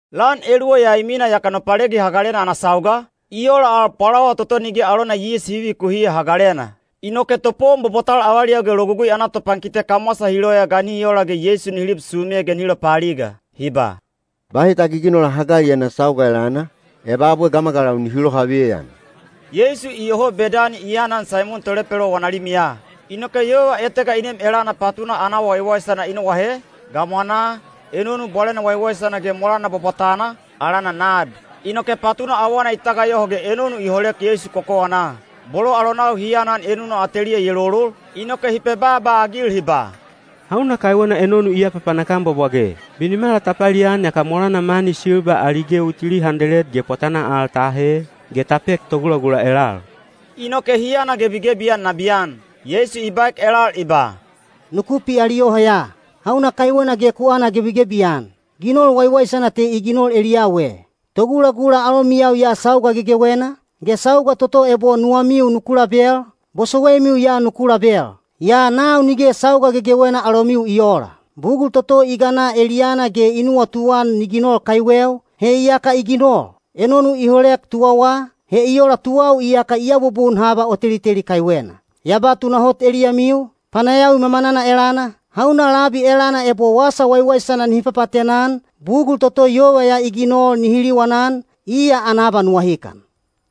Lan eluwa ya i mina yaka Nopalegi Hagalena ana sauga, i ola al Pwalawa toto Nige alona Yis Hi Vivikuhiya Hagalena. Inoke topowon bwabwatal avaliyau ge Logugui ana topankite kamwasa hi loya ga nihi ola ge Yeisu nihi lib sume ge nihi lopaaliga. Hi ba, “Bahi ta giginola hagali ana sauga elana, eba abwe gamagalau nihi lohaveyan.” Yeisu iyoho Bedani i aanan Saimon tolepelo wana limiya. Inoke yova etega i nem elana patuna ana awa waiwaisana i noahe, gamwanaa, enonu bwalena waiwaisana ge molana bwabwatana, alana nad. Inoke patuna awana i tagayoho ge enonu i holek Yeisu kokowanaa. Bolo alonau hi aanan enuna ateliya i elolol, inoke hi pebaaba-agil hi ba, “Hauna kaiwena enonu i apapanak-an bwabwage? Binimala ta palian yaka molana mani silba ali gewi tili handeled ge pwatanaa al ta ahe, ge ta pek togulagula elal.” Inoke hi anagebigebi-an nabiyan. Yeisu i baek elal i ba, “Nuku pialiyoho ya. Hauna kaiwena ge ku anagebigebi-an? Ginol waiwaisana te i ginol eliyau e. Togulagula alomiyau ya sauga gegewena, ge sauga toto ebo nuwamiu nuku label, bosowaimiu ya nuku label. Yaa nau nige sauga gegewena alomiu i oola. Bugul toto i gana eliyana ge i nuwatuan ni ginol kaiweu, he iyaka i ginol. Enonu i holek tuwawa, he i ola tuwau iyaka i abubun haba o teliteli kaiwena. Ya ba tunahot eliyamiu, panayawi mamanana elana, hauna labi elana ebo wasa waiwaisana nihi papaatena-an, bugul toto yova ya i ginol nihi liwanan, iya ana abanuwahikan.”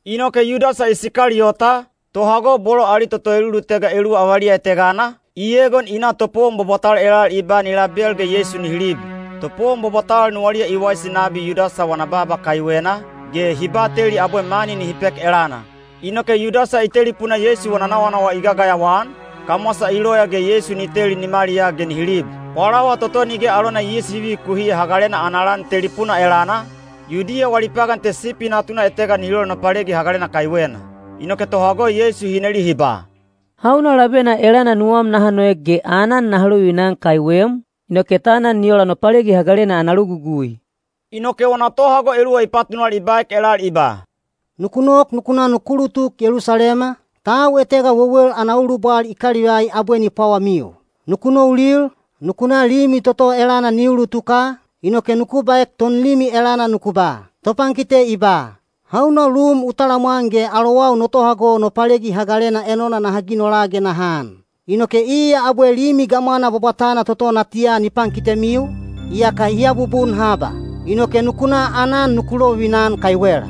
Inoke Yudasa Isikaliyota, tohago bolo ali toto elulutega eluwa avaliya etegana, i egon i na topowon bwabwatal elal i ba ni label ge Yeisu nihi lib. Topowon bwabwatal nuwaliya i waisi nabi Yudasa wana baaba kaiwena, ge hi bateli abwe mani nihi pek elana. Inoke Yudasa i telipuna Yeisu wana nawanawa i gagayawa-an, kamwasa i loya ge Yeisu ni teli nimaliyaa ge nihi lib. Pwalawa toto Nige alona Yis Hi Vivikuhiya Hagalena ana lan telipuna elana, Yudiya wali pagan te sipi natuna etega nihi lol Nopalegi Hagalena kaiwena. Inoke tohago Yeisu hi neli hi ba, “Hauna labena elana nuwam naha noek ge aanan naha lovivina-an kaiwem, inoke ta anan ni ola Nopalegi Hagalena ana logugui?” Inoke wana tohago eluwa i patunal i baek elal i ba, “Nuku nok nuku na nuku tuk Yelusalema, tau etega wewel ana ulubwal i kalivai abwe ni pwawamiu. Nuku noulil, nuku na limi toto elana ni ulutuka, inoke nuku baek tonlimi elana nuku ba, ‘Topankite i ba: Hauna lum u talamwan ge alowau no tohago Nopalegi Hagalena enona naha ginola ge naha an?’ Inoke iya abwe limi gamwana bwabwatana toto natiya ni pankitemiu, iyaka hi abubun haba. Inoke nuku na aanan nuku lovivina-an kaiwela.”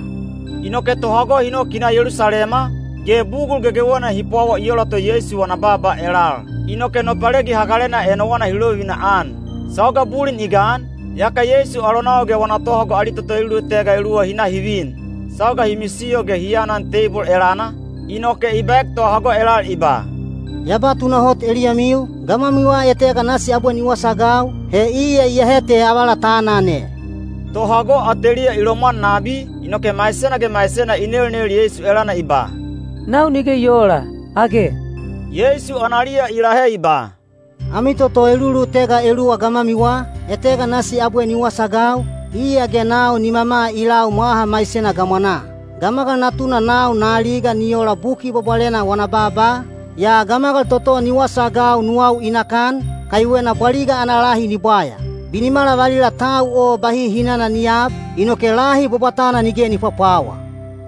Inoke tohago hi nok hi na Yelusalema, ge bugul gegewena hi pwawa i ola to Yeisu wana baaba elal. Inoke Nopalegi Hagalena enona hi lovivina-an. Sauga bulin i gan, yaka Yeisu alonau ge wana tohago ali toto elulutega eluwa hi na hi vin. Sauga hi misiyo ge hi aanan teibol elana, inoke i baek tohago elal i ba, “Ya ba tunahot eliyamiu, gamwamiwa etega nasi abwe ni wasaagau, he iya iyahe te avala ta aanan e.” Tohago ateliya i lomwan nabi, inoke maisena ge maisena i nelnel Yeisu elana i ba, “Nau nige i oola, age?” Yeisu analiya i lahe i ba, “Ami toto elulutega eluwa gamwamiwa, etega nasi abwe ni wasaagau, iya ge nau nimama i lau mwaha maisena gamwanaa. Gamagal Natuna nau na aliga ni ola Buki Bwabwalena wana baaba, yaa gamagal toto ni wasaagau nuwau i nakan, kaiwena bwaliga ana lahi ni bwaya. Binimala valila tau o bahi hinana ni aab, inoke lahi bwabwatana nige ni pwapwawa.”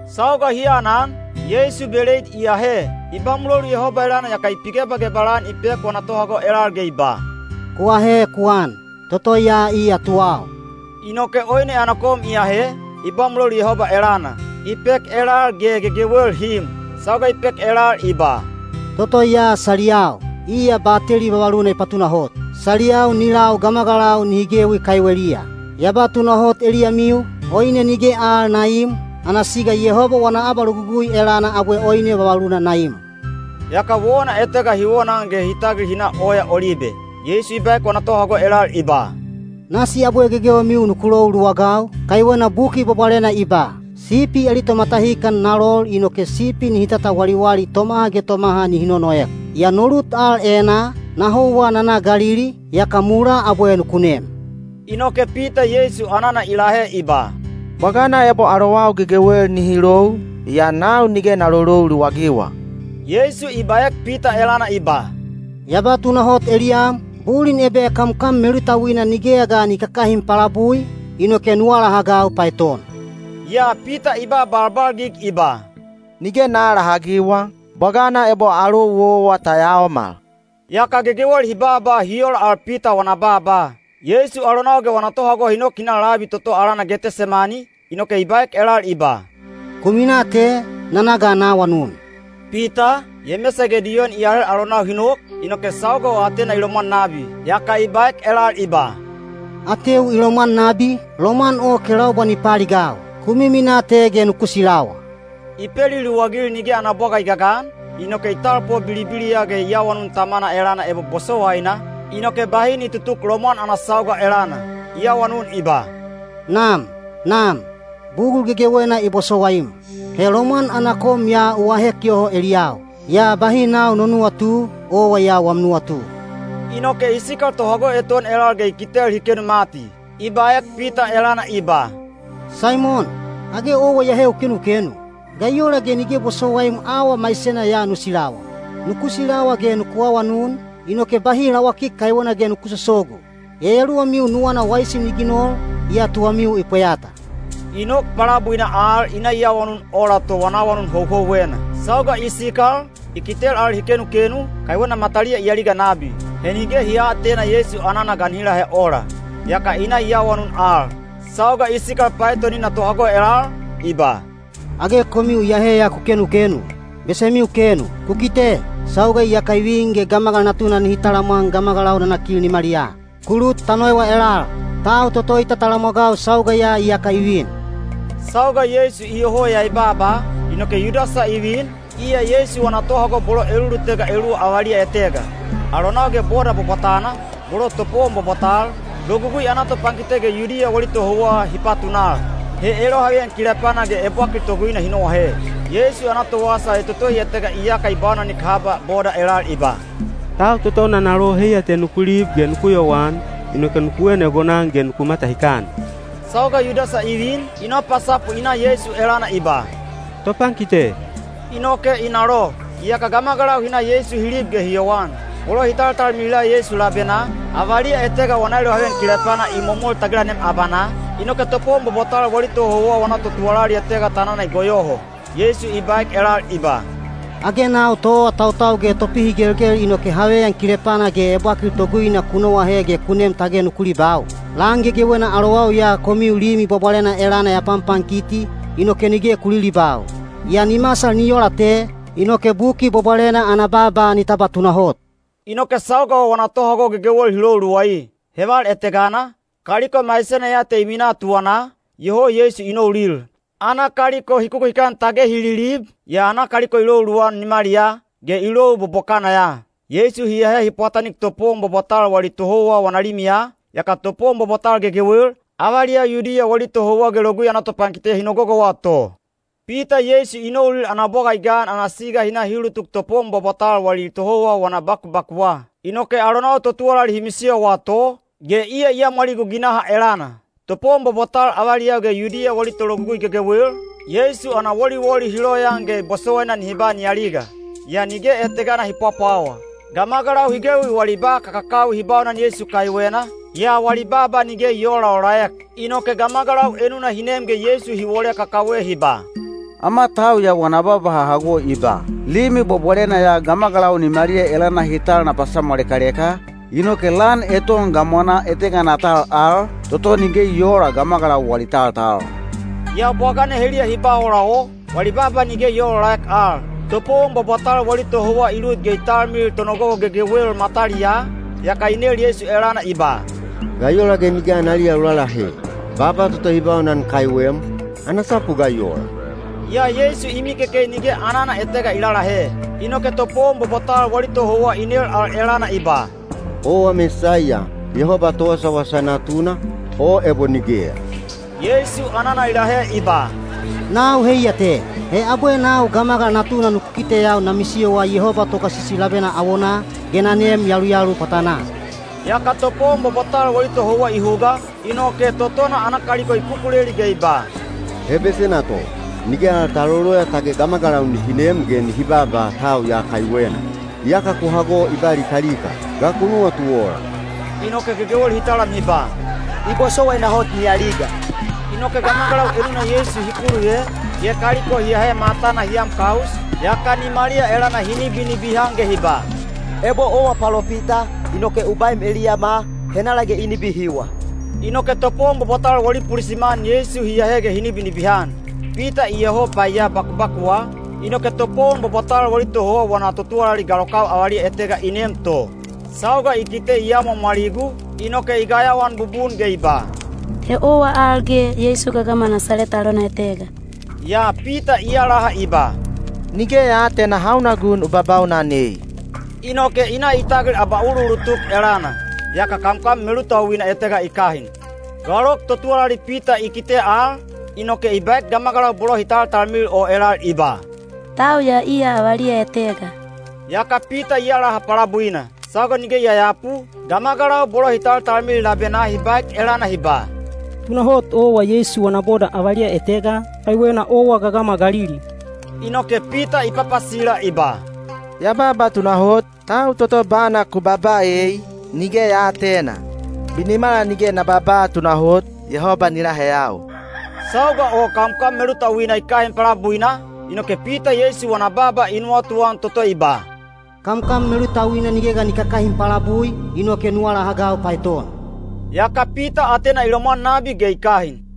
Sauga hi aanan, Yeisu beleid i ahe, i ba mulolu Yehoba elana yaka i pigebagebal-an i pek wana tohago elal ge i ba, “Ku ahe ku an. Toto ya iya tuwau.” Inoke oine ana kom i ahe, i ba mulolu Yehoba elana, i pek elal ge gegewel hi im. Sauga i pek elal i ba, “Toto ya saliyau, iya bateli vavaluna i patunahot. Saliyau ni lau gamagalau nihi gewi kaiweliya. Ya ba tunahot eliyamiu, oine nige al na iim, ana siga Yehoba wana abalogugui elana abwe oine vavaluna na im.” Yaka wona etega hi wonaan ge hi tagil hi na Oya Olibe. Yeisu i baek wana tohago elal i ba, “Nasi abwe gegewemiu nuku lou luwagau, kaiwena Buki Bwabwalena i ba, ‘Sipi ali tomatahikan na lol inoke sipi nihi tatawaliwali tomaha ge tomaha nihi nonoek.’ Yaa no lut al enaa, na houwa na na Galili, yaka mulaa abwe nuku nem.” Inoke Pita Yeisu anana i lahe i ba, “Bwagana ebo alowau gegewel nihi lou, yaa nau nige na lolou luwagiwa.” Yeisu i baek Pita elana i ba, “Ya ba tunahot eliyam, bulin ebe kamkam melutauina nigeya ga ni kakahin palabui, inoke nu alahagau paeton.” Yaa Pita i ba balbalgig i ba, “Nige na aalahagiwa, bwagana ebo alou owa ta yaomal.” Yaka gegewel hi baaba hi ola al Pita wana baaba. Yeisu alonau ge wana tohago hi nok hi na labi toto alana Getesemani, inoke i baek elal i ba, “Ku minaa te, na na ga na awanun.” Pita, Yemesa ge Diyon i ahel alonau hi nok, inoke sauga o atena i lomwan nabi. Yaka i baek elal i ba, “Ateu i lomwan nabi, lomwan o kelaubwa ni paaligau. Ku miminaa te ge nuku silawa.” I peliluwagil nige ana bwaga i gagan, inoke i talpo bilibiliya ge i awanun Tamana elana ebo bosowaina, inoke bahi ni tutuk lomwan ana sauga elana. I awanun i ba, “Nam! Nam! Bugul gegewena i bosowaim. He lomwan ana kom ya u ahek yoho eliyau. Yaa bahi nau no nuwatu, owa ya wam nuwatu.” Inoke i sikal tohago eton elal ge i kitel hi kenu mati. I baek Pita elana i ba, “Saimon, age owa iyahe u kenukenu? Ga i ola ge nige bosowaim auwa maisena ya nu silawa? Nuku silawa ge nuku awanun, inoke bahi lawakik kaiwena ge nuku sosogu. Yayaluwamiu nuwana waisi ni ginol, yaa tuwamiu i pweyata.” I nok palabuina al i na i awanun ola to wana awanun houhouwena. Sauga i sikal, i kitel al hi kenukenu, kaiwena mataliya i aliga nabi. He nige hi aatena Yeisu anana ga nihi lahe ola. Yaka i na i awanun al. Sauga i sikal paetonina tohago elal, i ba, “Age komiu iyahe ya ku kenukenu? Besemiu kenu! Ku kite, sauga iyaka i vin ge Gamagal Natuna nihi talamwan gamagalau nanakil nimaliyaa. Ku lut ta noewa elal. Tau toto i tatalamwagau sauga ya iyaka i vin!” Sauga Yeisu iyoho ya i baaba, inoke Yudasa i vin, iya Yeisu wana tohago bolo elulutega eluwa avaliya etega. Alonau ge boda bwabwatana, bolo topowon bwabwatal, Logugui ana topankite ge Yudiya wali tohouwa hi patunal. He elohaveyan kilepana ge ebwakil toguina hi noahe. Yeisu ana towasa etotohi etega iyaka i baunanik haba boda elal i ba, “Tau toto na nalo heiya te nuku lib ge nuku yowan, inoke nuku en egonan ge nuku matahikan.” Sauga Yudasa i vin, i nopasapu i na Yeisu elana i ba, “Topankite,” inoke i nalo. Yaka gamagalau hi na Yeisu hi lib ge hi yowan. Bolo hi taltalmilila Yeisu labenaa, avaliya etega wana elohaveyan kilepana i momol tagilanem abanaa, inoke topowon bwabwatal wali tohouwa wana totuwalali etega tanana i goyoho. Yeisu i baek elal i ba, “Age nau toawatautau ge topihigelgel inoke haveyan kilepana ge ebwakil toguina ku noahe ge ku nem tage nuku libau? Lan gegewena alowau ya komiu Limi Bwabwalena elana ya panpankiti, inoke nige ku lilibau. Yaa ni masal ni ola te, inoke Buki Bwabwalena ana baaba ni tabwa tunahot.” Inoke sauga o wana tohago gegewel hi lou luwai. Heval etegana, kaliko maisena ya te i minaa tuwanaa, iyoho Yeisu i noulil. Ana kaliko hi kukuhikan tage hi lilib, yaa kaliko i lou luwan nimaliyaa, ge i lou bobokana ya. Yeisu hi ahe hi pwatanik topowon bwabwatal wali tohouwa wana limiya, yaka topowon bwabwatal gegewel, avaliyau Yudiya wali tohouwa ge Logugui ana topankite hi nogogowa to. Pita Yeisu i noulil ana bwaga i gan ana siga hi na hi ulutuk topowon bwabwatal wali tohouwa wana bakubakuwa. Inoke alonau totuwalali hi misiyowa to, ge iya i amwaligu ginaha elana. Topowon bwabwatal avaliyau ge Yudiya wali tologugui gegewel, Yeisu ana woliwoli hi loyaan ge bosowaina nihi ba ni aliga. Yaa nige etegana hi pwapwawa. Gamagalau hi gewi wali ba kakakawi hi baunan Yeisu kaiwena, yaa wali baaba nige i oolaolaek. Inoke gamagalau enuna hi nem ge Yeisu hi wole kakawe hi ba, “Ama tau ya wana baaba ha hago i ba, ‘Limi Bwabwalena ya gamagalau nimaliya elana hi tal na pasamwalekaleka, inoke lan eton gamwanaa etegana na tal al, toto nige ni oola gamagalau wali taltal.’” Yaa bwagana heliya hi ba ola o, wali baaba nige i oolaolaek al. Topowon bwabwatal wali tohouwa i lut ge i talmilil tonogogo gegewel mataliyaa, yaka i nel Yeisu elana i ba, “Ga i ola ge nige analiya u lalahe? Baaba toto hi baunan kaiwem, ana sapu ga i ola?” Yaa Yeisu i mikekei nige anana etega i lalahe. Inoke topowon bwabwatal wali tohouwa i nel al elana i ba, “Owa Mesaiya, Yehoba Towasawasa Natuna, o ebo nigeya?” Yeisu anana i lahe i ba, “Nau heiya te. He abwe nau Gamagal Natuna nuku kiteyau na misiyowa Yehoba Togasisi labena awonaa, ge na neem yaluyalu pwatanaa.” Yaka topowon bwabwatal wali tohouwa i huga, inoke totona ana kaliko i kukuleli ge i ba, “He besena to. Nige al ta loloya tage gamagalau nihi nem ge nihi baaba tau ya kaiwena. Iyaka ku hago i ba likalika. Ga ku nuwatu ola?” Inoke gegewel hi talam hi ba, “I bosowaina hot ni aliga.” Inoke gamagalau enuna Yeisu hi kuluve, ge kaliko hi ahe matana hi am kaus, yaka nimaliya elana hi nibinibihan ge hi ba, “Ebo owa palopita, inoke u baem eliyama, henala ge i nibihiwa?” Inoke topowon bwabwatal wali pulisiman Yeisu hi ahe ge hi nibinibihan. Pita iyoho paiya bakubakuwa, inoke topowon bwabwatal wali tohouwa wana totuwalali galokau avaliya etega i nem to. Sauga i kite i amwaamwaligu, inoke i gayawaan bubun ge i ba, “He owa al ge Yeisu gagama Nasaleta alona etega.” Yaa Pita i alaha i ba, “Nige ya aatena hauna gun u babaunan ei.” Inoke i na i tagil abauluulutuk elana. Yaka kamkam melutauina etega i kahin. Galok totuwalali Pita i kite al, inoke i baek gamagalau bolo hi taltalmilil o elal i ba, “Tau ya iya avaliya etega.” Yaka Pita i alaha palabuina. Sauga nige i yayapu, gamagalau bolo hi taltalmilil labenaa hi baek elana hi ba, “Tunahot owa Yeisu wana boda avaliya etega, kaiwena owa gagama Galili.” Inoke Pita i papasila i ba, “Ya baaba tunahot, tau toto bana ku babaa ei, nige ya aatena. Binimala nige na babaa tunahot, Yehoba ni laheyau.” Sauga o kamkam melutauina i kahin palabuina, inoke Pita Yeisu wana baaba i nuwatuan toto i ba, “Kamkam melutauina nige ga ni kakahin palabui, inoke nu alahagau paeton.” Yaka Pita atena i lomwan nabi ge i kahin.